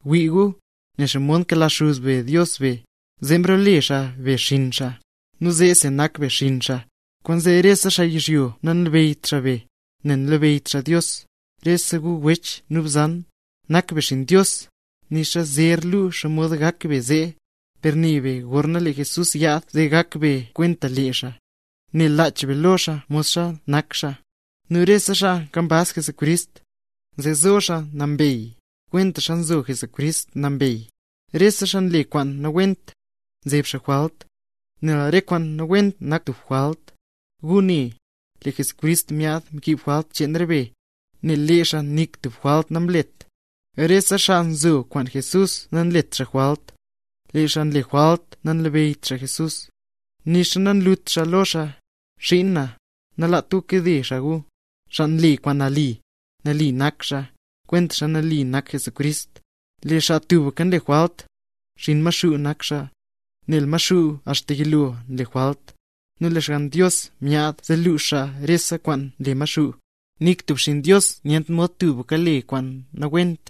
¡Wii gu, ne xomod nkela Xuz be Dios re be, zee mrole xaa be xinn xaa, nu zeesi nak be xinn xaa! Kwaanzee rese xaa yizhyo nanlabeyyt xaa be, nel nanlabeyyt xaa Dios. Rese gu wech nu bzan, nak be xinn Dios. Nixa zer lu xomod gak be zee. Per ne be gorna lee Jesús yaad zee gak be kwenta lee xaa, nel lach be lo xaa modlalsa nak xaa. Nu rese xaa nkambaz Jesucrist, zee zo xaa nambey, kwentaxa nzo Jesucrist nambey. Rese xaa nle kwaan nawent, nzeb xaa jwalt; nel re kwaan nawent nak tub jwalt. Gu ne, lee Jesucrist myaad mkiib jwalt cheen re be, nel lee xaa nik tub jwalt namlet. Rese xaa nzo kwaan Jesús nanlet xaa jwalt, lee xaa nle jwalt nanlabeyyt xaa Jesucrist, nixa nanlut xaa lo xaa. Xiin na, nalaat gu kade xaa gu. Xaa nle kwaan nali, nali nak xaa, kwentaxa nali nak Jesucrist. Lee xaa tubka nle jwalt, xinn Maxuu nak xaa, nel Maxuu axta yilo nle jwalt. Nu lee Xgann Dios myaad zee luux xaa rese kwaan nle Maxuu. Nik tub xinn Dios nyent mod tubka le kwaan nawent,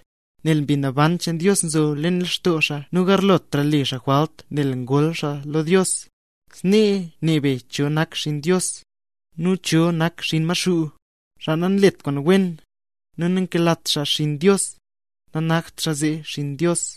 nel Mbi Naban cheen Dios nzho leen lextoo xaa nu nagarlotra le xaa jwalt nel ngol xaa lo Dios. Snee ne be cho nak xinn Dios, nu cho nak xinn Maxuu. Xaa nanlet kwaan wen, nu nankelat xaa xinn Dios, nanakt xaa zee xaa Dios.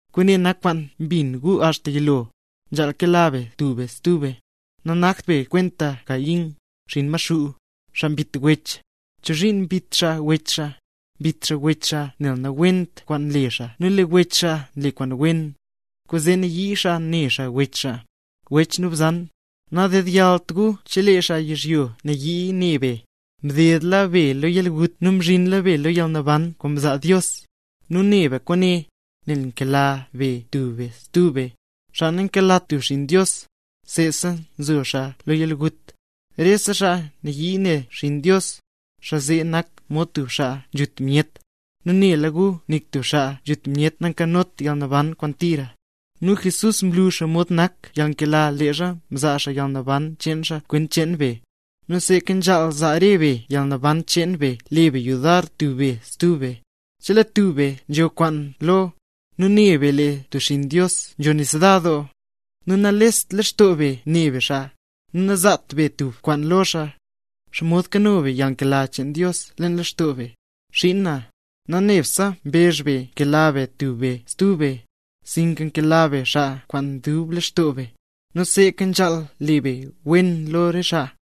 Kwaane nak kwaan mbin gu axta yilo: Nzhaal kela be tub be stub be. Nagakt be kwenta Caín, xinn Maxuu, xaa mbit wech. ¿Chozhiin mbit xaa wech xaa? Mbit xaa wech xaa nel nawent kwaan nle xaa nu lee wech xaa nle kwaan wen, kwaanzee nayii xaa ne xaa wech xaa. Wech nu bzan, nadedyallt gu chelee xaa yizhyo yii ne be. Mdedla be lo yalgut nu mzhinla be lo yalnaban kwaan nzaa Dios, nu ne be kwaane, nel nkela be tub be stub be. Xaa nankelat tub xinn Dios, seesa nzo xaa zee lo yalgut. Rese xaa nayii ne tub xinn Dios, xaa zee nak mod tub xaa nzhut myet, nu nela gu nik tub xaa nzhut myet nankanot yalnaban kwaan tira. Nu Jesús mlu xomod nak yalnkela leezha mzaa xaa yalnaban cheen xaa kwent cheen be. Nu seeka nzhaal zaa re be yalnaban cheen be le be yudar tub be stub be. Chelee tub be nzho kwaan lo, nu ne be lee tub xinn Dios nzho nisda doo, nu nanlest lextoo be ne be xaa, nu nanzaat be tub kwaan lo xaa, ¿xomod nkano be yalnkela cheen Dios leen lextoo be? Xiin na, nanebtse mbezh be nkela be tub be stub be, sinka kela be xaa kwaan dub lextoo be, nu seeka nzhaal le be wen lo xaa.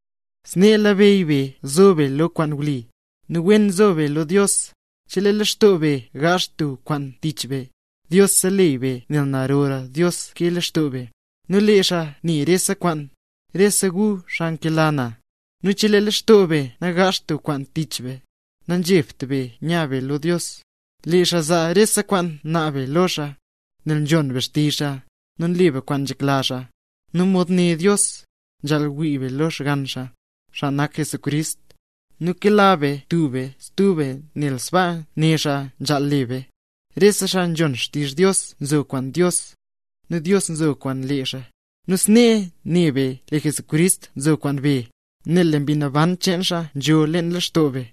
Snee nlabeyy be nzo be lo kwaan wli, nu wen nzo be lo Dios, chelee lextoo be gaazh tub kwaan tich be, Dios seleyy be nel narora Dios ke lextoo be. Nu lee xaa ne rese kwaan. Rese gu xaa nkela na, nu chelee lextoo be nagaazht tub kwaan tich be, nazhebt be nya be lo Dios. Lee xaa zaa rese kwaan naab be lo xaa, nel nzhon be xtizh xaa, nu nle be kwaan nzhekla xaa. Nu mod né Dios, nzhaal wii be lo Xgann xaa, xaa nak Jesucrist, nu kela be tub be stub be nel sbaa né xaa nzhaal le be. Rese xaa nzhon xtizh Dios nzo kwaan Dios, nu Dios nzo kwaan lee xaa. Nu snee ne be lee Jesucrist nzo kwaan be, nel Mbi Naban cheen xaa nzho leen lextoo be.